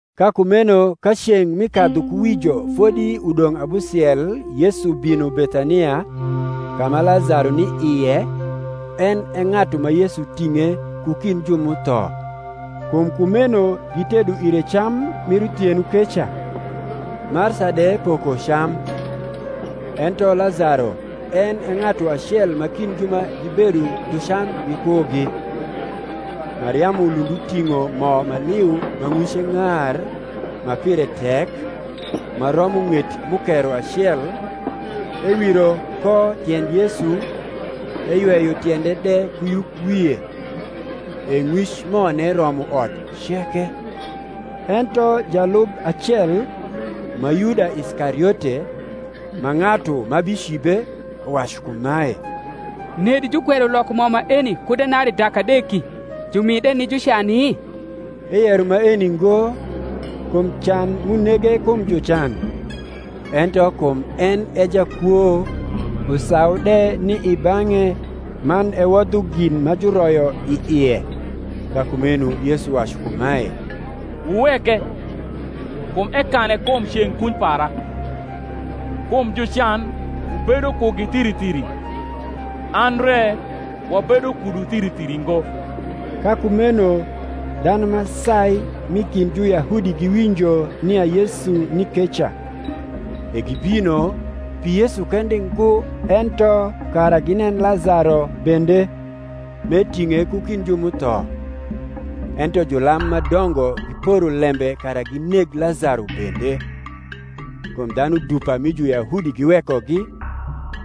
Ka kumeno ka ceng’ mi kadhukuwijo fodi udong’ abusiel Yesu bino Bethania, ka ma Lazaro ni ie, en e ng’atu ma Yesu ting’e ku kind ju m’utho. Kum kumeno gitedo ire cam mir uthieno keca: Marsa de poko cam; ento Lazaro en e ng’atu acel ma kind ju ma gibedo dhu cam gikugi. Mariamu lund uting’o mo ma liu ma ng’wice ng’ar, ma pire tek, ma romo ng’et mukero acel, ewiro ko tiend Yesu, eyweyo tiende de ku yukwie: e ng’wic mone romo ot ceke. Ento jalub acel, ma Yuda Iskariote, ma ng’atu ma bicibe, uwacu kumae, Nedi jukwero loko mo maeni ku denarii dak adeki, jumi de ni jucani? Eyero maeni ngo, kum can m’unege kum jucan; ento kum en e jakwo, usau de ni i bang’e man ewodho gin ma juroyo i ie. Ka kumeno Yesu wacu kumae, Wuweke, kum ekane kum ceng’ kuny para. Kum jucan wubedo kugi thiri thiri; an re wabedo kudu thiri thiri ngo. Ka kumeno dhanu ma sai m’i kind Juyahudi giwinjo nia Yesu ni keca: e gibino, pi Yesu kende ngo ento kara ginen Lazaro bende, m’eting’e ku kind ju m’utho. Ento julam ma dongo giporo lembe kara gineg Lazaro bende; kum dhanu dupa mi Juyahudi giwekogi,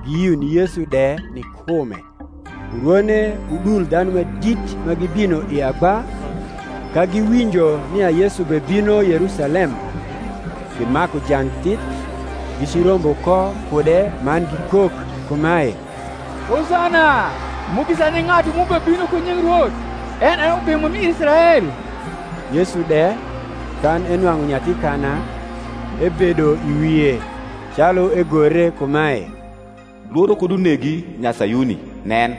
giyio ni Yesu de ni kume. Urwone udul dhanu ma dit ma gibino i agba, ka giwinjo nia Yesu bebino Yerusalem, gimaku jang thith, gicirombo ko kude man gikok kumae, Hosana: Mugisa ni ng’atu m’ubebino ku nying Rwoth, en e Ubimo mir Israel. Yesu de, kan enwang’u nyathi kana, ebedo i wie; calu egore kumae, Lworo kud unegi, nya Sayuni: nen,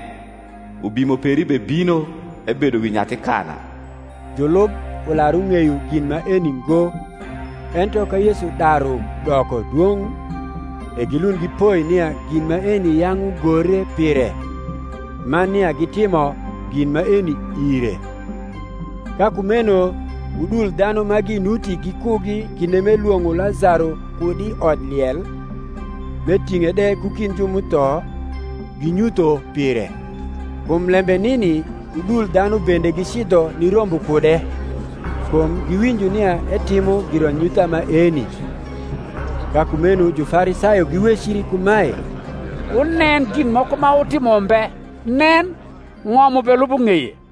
Ubimo peri bebino, ebedo wi nyathi kana. Julub ular ung’eyo gin maeni ngo: ento ka Yesu daru doko dwong’, e gilund gipoi nia gin maeni yang’ ugore pire, man nia gitimo gin maeni ire. Ka kumeno udul dhanu ma ginuti gikugi kinde m’elwong’o Lazaro kud i odliel, m’eting’e de ku kind ju m’utho, ginyutho pire. Kum lembe nini udul dhanu bende gicidho nirombo kude, kum giwinjo nia etimo giranyutha maeni. Ka kumeno Jufarisayo giwecri kumae, Wunen gin moko ma wutimo mbe; nen, ng’om ubelubo ng’eye.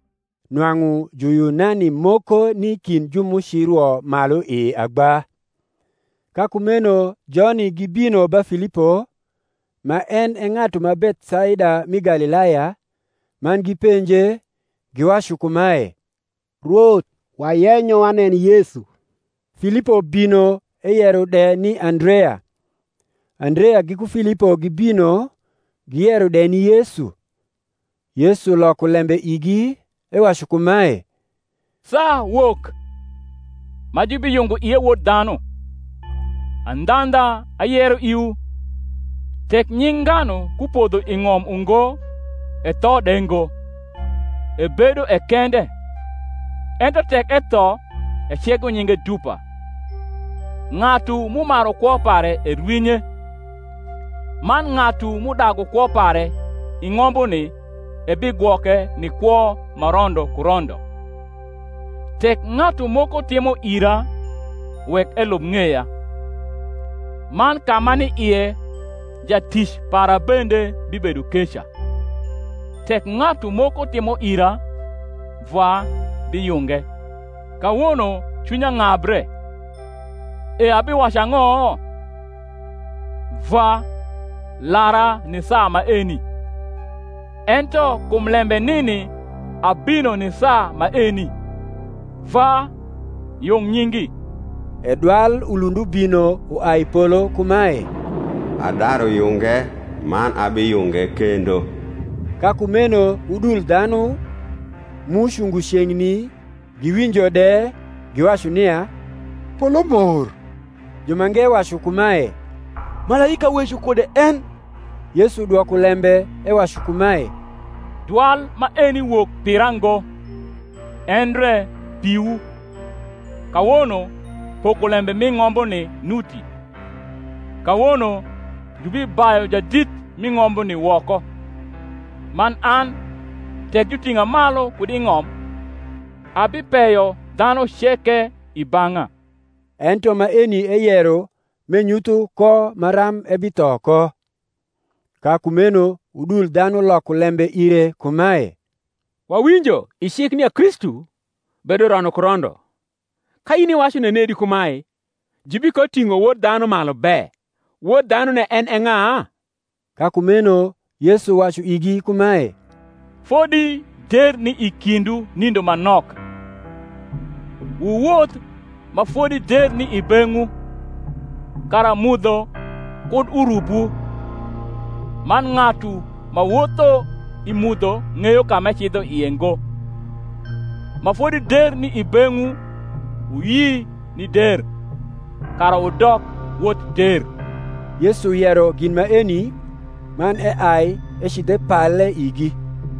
Nwang’u Juyunani moko ni kind ju m’ucirwo malu i agba: ka kumeno joni gibino ba Filipo, ma en e ng’atu ma Bethsaida mi Galilaya, man gipenje, giwacu kumae, Rwoth, wayenyo wanen Yesu. Filipo bino eyero de ni Andrea: Andrea giku Filipo gibino, giyero de ni Yesu. Yesu loko lembe igi, ewacu kumae, Saa wok, ma jubiyungo ie Wod dhanu. Andhandha, ayero iwu, Tek nying’ nganu kupodho i ng’om ungo etho de ngo, ebedo e kende; ento tek etho, ecego nyinge dupa. Ng’atu m’umaru kwo pare erwinye; man ng’atu m’udagu kwo pare i ng’ombuni ebigwoke ni kwo ma rondo ku rondo. Tek ng’atu moko timo ira, wek elub ng’eya; man ka m’ani ie, jatic para bende bibedo keca: tek ng’atu moko timo ira, Vwa biyunge. Kawono cwinya ng’abre; e abiwacu ang’o? Vwa, lara ni saa maeni. Ento kum lembe nini abino ni saa maeni. Vwa, yung nyingi. E dwal ulund ubino uai i polo kumae, Adaru yunge, man abiyunge kendo. Ka kumeno udul dhanu, m’ucungo ceng’ni, giwinjo de, giwacu nia polo mor: jumange wacu kumae, Malaika weco kude en. Yesu dwoko lembe ewacu kumae, Dwal maeni wok pira ngo, endre piwu. Kawono pokolembe mi ng’ombuni nuti: kawono jubibayu jadit mi ng’ombuni woko. Man an, tek juting’a malu kud i ng’om, abipeyo dhanu ceke i bang’a. Ento maeni eyero m’enyutho ko maram ebitho ko. Ka kumeno udul dhanu loko lembe ire kumae, Wawinjo i cik nia Kristu bedo rondo ku rondo: ka in iwacu nenedi kumae, Jubikoting’o Wod dhanu malu be? Wod dhanune en e ng’a? Ka kumeno Yesu wacu igi kumae, Fodi der ni i kindwu nindo ma nok. Wuwoth ma fodi der ni i beng’wu, kara mudho kud urubwu: man ng’atu ma wotho i mudho ng’eyo ka m’ecidho i ie ngo. Ma fodi der ni i beng’wu, wuyi ni der, kara wudok wot der. Yesu yero gin maeni, man eai ecidh epale igi.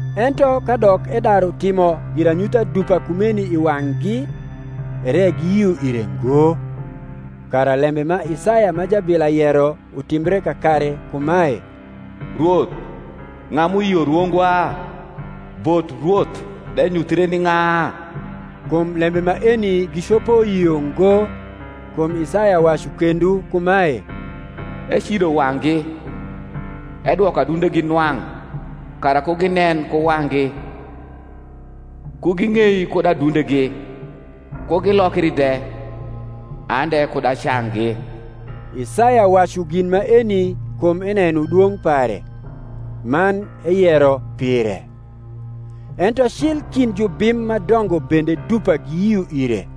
Ento kadok edaru timo giranyutha dupa kumeni i wang’gi, ere giyio ire ngo: kara lembe ma Isaya ma jabila yero utimbre kakare kumae, Rwoth, ng’a m’uyio rwongwa? Bot Rwoth de nyuthre ni ng’a? Kum lembe maeni gicopo yio ngo, kum Isaya wacu kendo kumae, Ecido wang’gi, edwoko adundegi nwa ng’, Kara ku ginen ku wang’gi, ku ging’ei kud adundegi, Ku gilokri de, an de kud acanggi. Isaya wacu gin maeni kum eneno dwong’ pare; man eyero pire. Ento cil kind jubim ma dongo bende dupa giyio ire;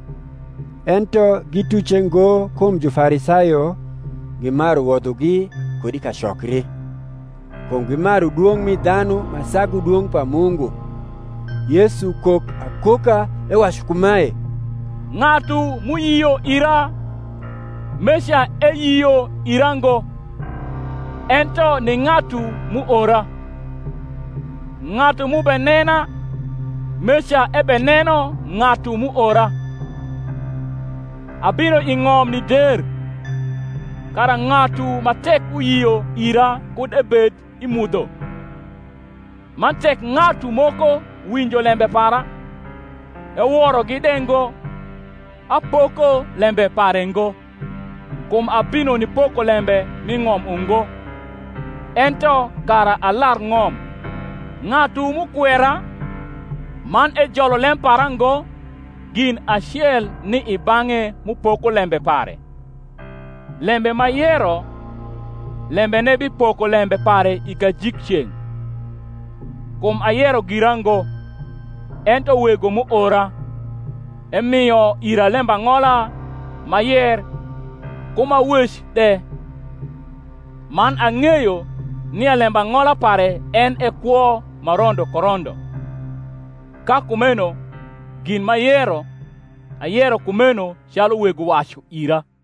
ento gituce ngo kum Jufarisayo, gimaru wodhogi kud i kacokri: kum gimaru dwong’ mi dhanu ma sagu dwong’ pa Mungu. Yesu kok akoka ewacu kumae, Ng’atu m’uyio ira, meca eyio ira ngo, ento ni ng’atu m’uora. Ng’atu m’ubenena, meca ebeneno ng’atu m’uora. Abino i ng’om ni der, kara ng’atu ma tek uyio ira kud ebed i mudho. Man tek ng’atu moko winjo lembe para, eworogi de ngo, apoko lembe pare ngo: kum abino nipoko lembe mi ng’om ungo, ento kara alar ng’om. Ng’atu m’ukwera, man ejolo lem para ngo, gin acel ni i bang’e m’upoko lembe pare: lembe m’ayero, lembene bipoko lembe pare i kajikceng’. Kum ayero gira ngo; ento Wego m’uora, emio ira lembang’ola, m’ayer, ku m’awec de. Man ang’eyo nia lembang’ola pare en e kwo ma rondo ku rondo; ka kumeno gin m’ayero, ayero kumeno calu Wego wacu ira.